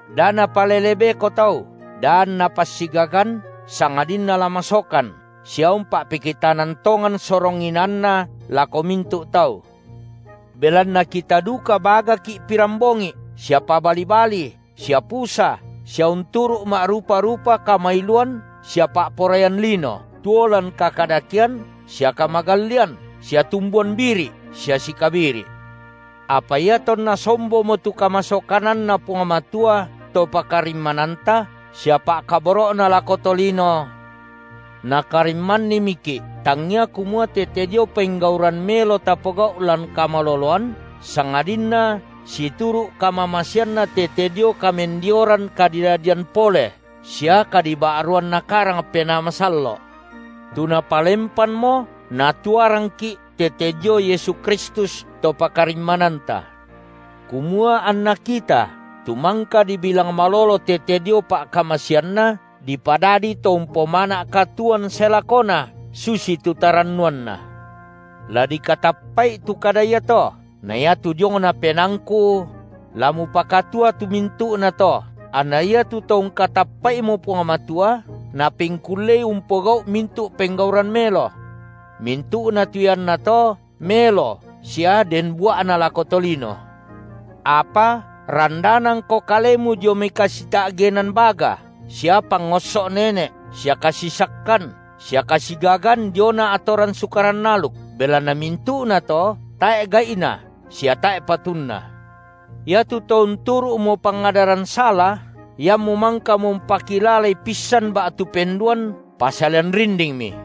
Da napalele beko tau, da anna passigagan, sangadinna la masokan, sia umpa’pekitanan tongan sorong inaanna lako mintu’ tau. Belanna kita duka bagaki’ pirambongi’ sia pabali-bali sia pusa sia unturu’ ma’rupa-rupa kamailuan sia pa’poraian lino, tuo lan kakadakean sia kamagallian sia tumbuan biri’ sia sikabiri’. Apa iatonna sombomo tu kamasokananNa Puang Matua, To pakarimmananta, sia pa’kaboro’Na lako tolino, Nakarimmannimiki’, tangia kumua tete dio penggauran melo tapogau’ lan kamaloloan, sangadinna situru’ kamamaseanNa tete dio kamendioran kadidadian pole sia kadiba’ruan Nakarang Penaa Masallo’, tu Napalempanmo Natuarangki’ tete dio Yesu Kristus, To pakarimmananta, kumua anna kita, tu mangka dibilang malolo tete dio pa’kamaseanNa, dipadadi to umpomana’ katuoan sae lakona, susitu tarannuanna. La dikatappa’i tu kada iato; na iatu diongna penaangku: la mupakatua tu mintu’nato, anna iatu to ungkatappa’imo Puang Matua, napengkullei umpogau’ mintu’ penggauran melo. Mintu’na tu iannato melo sia den bua’na lako tolino. Apa randanangko kalemu dio mai kasita’genan baga sia pangosso’ nene’ sia kasisakkan sia kasigagan diona atoran Sukaran aluk, belanna mintu’nato tae’ gai’na sia tae’ patunna. Iatu to unturu’mo pangadaran sala, iammu mangkamo umpakilalai pissan ba’tu penduan, pasalian rindingmi.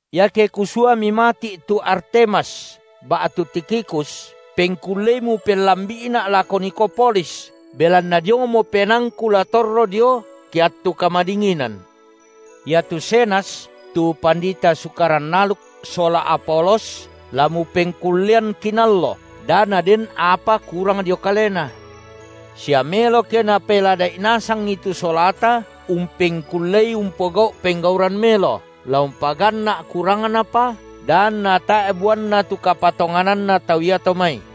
Iake kusuami mati’ tu Artemas ba’tu Tikhikus, pengkullei mupellambi’ina’ lako Nikopolis belanna diongmo penaangku la torro dio ke attu kamadinginan. Iatu Zenas, tu pandita Sukaran aluk sola Apolos la mupengkullean kinallo, da naden apa kurang dio kalena. Sia melo ke napelada’i nasangi tu solata umpengkullei umpogau’ penggauran melo, la umpaganna’ kurangnapa, da anna tae’ buanna tu kapatongananna tau iato mai.